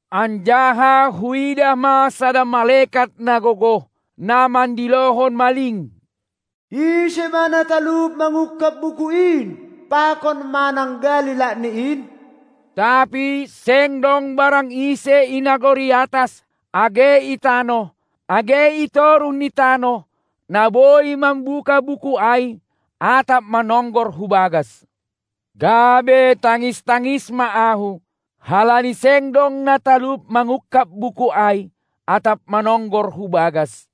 Anjaha huidah ma sada malekat na gogoh, na mandilohon maling: Ise ma na talup mangungkab buku in pakon mananggali lakni in? Tapi seng dong barang ise i nagori atas, age i tanoh, age i toruh ni tanoh, na boi mambuka buku ai atap manonggor hu bagas. Gabe tangis-tangis ma ahu, halani seng dong na talup mangungkab buku ai atap manonggor hu bagas.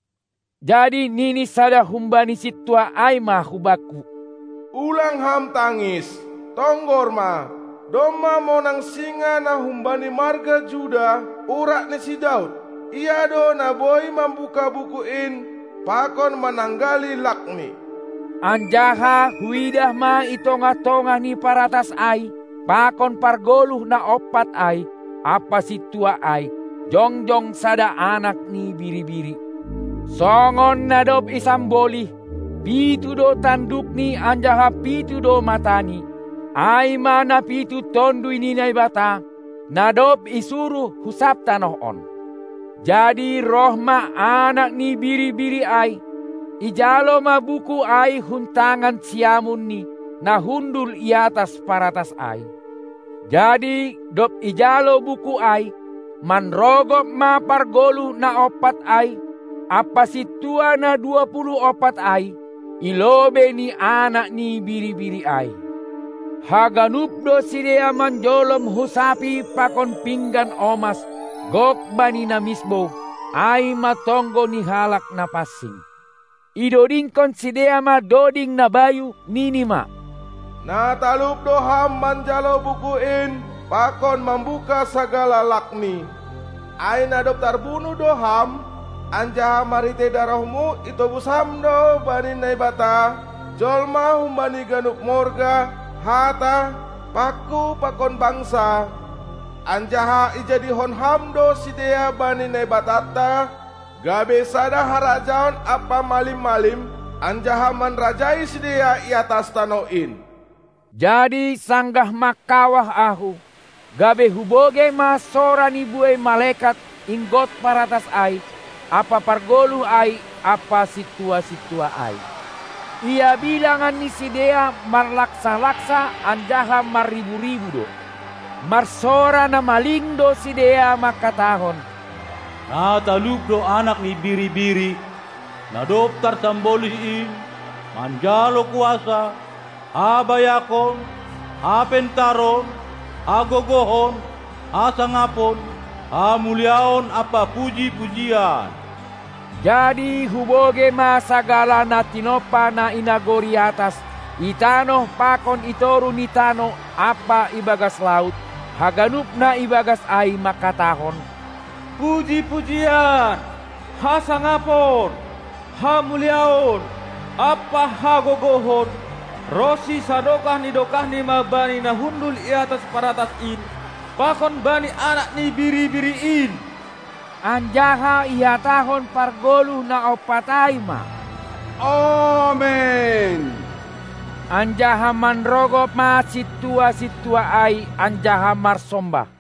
Jadi nini sada humbani sintua ai ma hubakku: Ulang ham tangis! Tonggor ma, domma monang singa na humbani marga Juda, urat ni si Daud. Ia do na boi mambuka buku in pakon mananggali lakni. Anjaha huidah ma i tongah-tongah ni paratas ai pakon pargoluh na ompat ai ampa sintua ai jongjong sada Anak ni Biri-biri, songon na dob isambolih, pitu do tandukni anjaha pitu do matani, ai ma na pitu Tonduy ni Naibata, na dob isuruh hu sab tanoh on. Jadi roh ma Anak ni Biri-biri ai, ijalo ma buku ai hun tangan siamun ni na hundul iatas paratas ai. Jadi dob ijalo buku ai, manrongop ma pargoluh na ompat ai ampa sintua na dua puluh ompat ai i lobei ni Anak ni Biri-biri ai; haganup do sidea manjolom husapi pakon pinggan omas gok bani na misbou, ai ma tonggo ni halak na pansing. Idodingkon sidea ma doding na bayu, nini ma: Na talup do Ham manjalo buku in pakon mambuka sagala lakni; ai na dob tarbunuh do Ham anjaha marhitei darohmu itobus Ham do bani Naibata jolma humbani ganup morga, hata, pangku pakon bangsa, anjaha ijadihon Ham do sidea bani Naibatanta gabe sada harajaon ampa malim-malim, anjaha manrajai sidea i atas tanoh in. Jadi sanggah mangkawah ahu, gabe hubogei ma sora ni buei malekat inggot paratas ai ampa pargoluh ai ampa sintua-sintua ai; ia bilangan ni sidea marlaksa-laksa anjaha marribu-ribu do. Marsora na maling do sidea manghatahon: Na talup do Anak ni Biri-biri, na dob tarsambolih in, manjalo kuasa, habayakon, hapentaron, hagogohon, hasangapon, hamuliaon ampa puji-pujian. Jadi hubogei ma sagala na tinompa na i nagori atas, i tanoh pakon i toruh ni tanoh ampa ibagas laut, haganup na ibagas ai manghatahon: Puji-pujian, hasangapon, hamuliaon ampa hagogohon ronsi sadokah ni dokahni ma bani na hundul i atas paratas in pakon bani Anak ni Biri-biri in! Anjaha ihatahon pargoluh na ompat ai ma: Amen! Anjaha manrogop ma sintua-sintua ai anjaha marsombah.